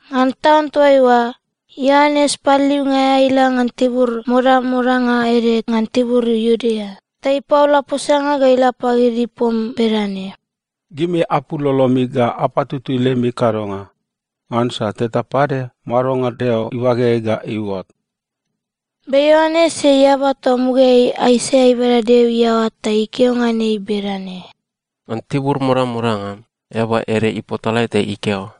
Ngan taun toaiua, Ioanes Paliliunga aea ila ngan tibur modamodanga ede ngan tibur Iudea ta ipaola posanga ga ila pagid ipom bedane, “Gimi apul lolomi ga apatutui lemi kadonga! Ngansa teta pade madonga Deo ibageai ga iuot.” Be Ioanes ei eaba toa mugaeai Aisaia ibada Deo iaoa ta ikeo ngan ei bedane, “Ngan tibur modamodanga, eaba ede ipotalae ta ikeo,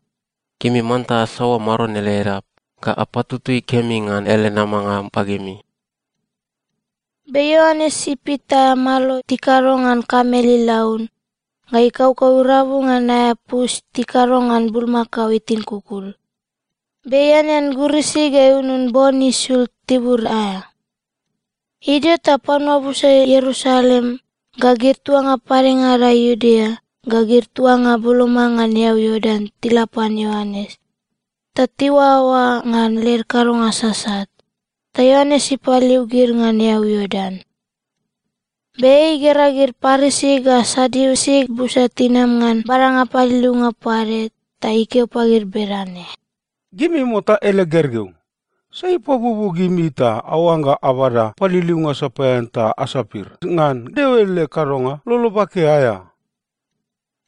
‘Gimi manta asaoa Maron ele edap ga apatutui kemi ngan ele namanga pagimi.’” Be Ioanes ipit aea malo tikado ngan kamel ilaun, ga ikaukau irabu ngan aea pus tikado ngan bulmakao itin kukul. Be ianean gurisi ga iunun bon isul tibur aea. Idio ta panua busa Ierusalem, ga gid tuanga padengada Iudea, ga gid tuanga boloma ngan eau Iordan tila pan Ioanes. Ta tiuaoa ngan led kadonga sasat, ta Ioanes ipaliliu gid ngan eau Iordan. Be ei igera gid Parisi ga Sadiusi busa tinama ngan badanga paliliunga pade, ta ikeo pagid bedane, “Gimi mota ele gergeu! Sai ipabuobuo gimi ta aoangga abada paliliunga sapaean ta asapir ngan Deo ele kadonga lolo bake aea?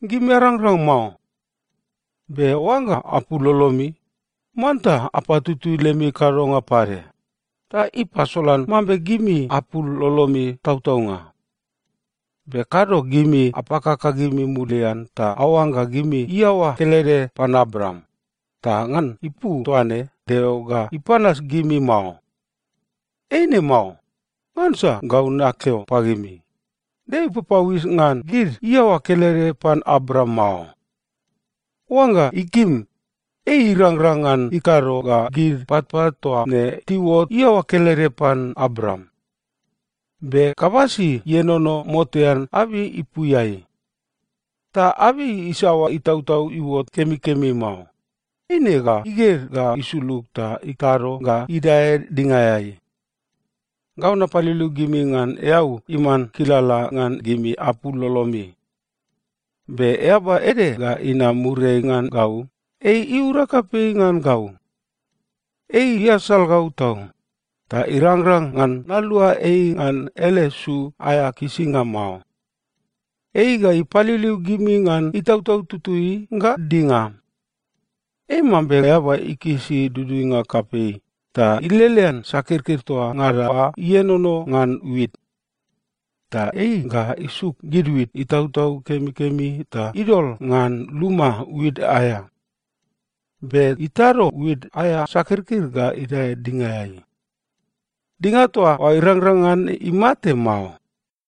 Gimi arangrang mao. Be oangga apul lolomi, manta apatutui lemi kadonga pade, ta ipasolan mambe gimi apul lolomi tautaunga. Be kado gimi apakaka gimi mulian ta aoangga gimi iaoa kelede pan Abraam, ta ngan ipu toaine Deo ga ipanas gimi mao. Eine mao. Ngansa gau nakeo pagimi, Deo ipapauis ngan gid iaoa kelede pan Abraam mao. Oangga ikim, ei irangrang ngan ikado ga gid patpat toa ne tiuot iaoa kelede pan Abraam. Be kabasi ienono motean abei ipuiai. Ta abei isaoa itautau iuot kemikemi mao, eine ga iged ga isulug ta itado ga idae dingaeai. “Gau napaliliu gimi ngan eau iman kilala ngan gimi apul lolomi. Be eaba ede ga inam muriai ngan gau, ei iura kapei ngan gau. Ei iasal gau tau, ta irangrang ngan nalua ei ngan ele su aea kisinga mao. Ei ga ipaliliu gimi ngan Itautau Tutui ga dinga. Ei mambe eaba ikisi duduinga kapei ta ilelean sakirkir toa ngada oa ienono ngan wit. Ta ei ga isuk gid wit itautau kemikemi ta idol ngan luma wit aea. Be itado wit aea sakirkir ga idae dingaeai. Dinga toa oa irangrang ngan imate mao.”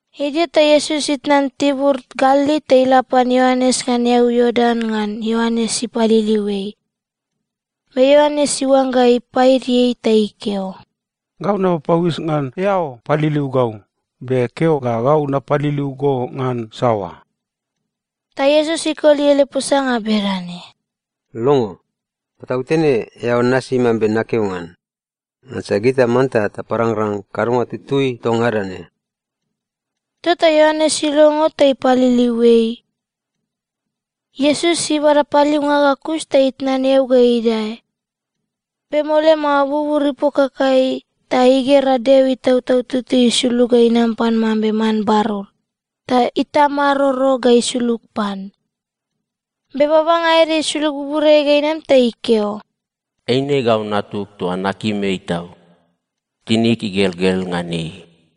Idio ta Iesus itnan tibur Galili ta ila pan Ioanes ngan eau Iordan ngan Ioanes ipaliliu ei. Be Ioanes iuangga ipaidi ei ta ikeo, “Gau napapauis ngan eao paliliu gau, be keo ga gau napaliliu go ngan saoa?” Ta Iesus ikoli ele posanga bedane, “Longo. Patautene eao nasi mambe nakeo ngan. Ngansa gita manta taparangrang kadonga tutui toa ngada ne.” Tota Ioanes ilongo ta ipaliliu ei. Iesus ibada paliliunga ga kus ta itnan eau ga idae. Be mole mao bubur ipokakai, ta igera Deo Itautau Tutui isulug ga inam pan mambe man barur, ta itamaroro ga isulug pan. Be babanga ede isulug buburiai ga inam ta ikeo, “Eine gau Natug toa nakim ei tau. Tinig igelgel ngan ei.”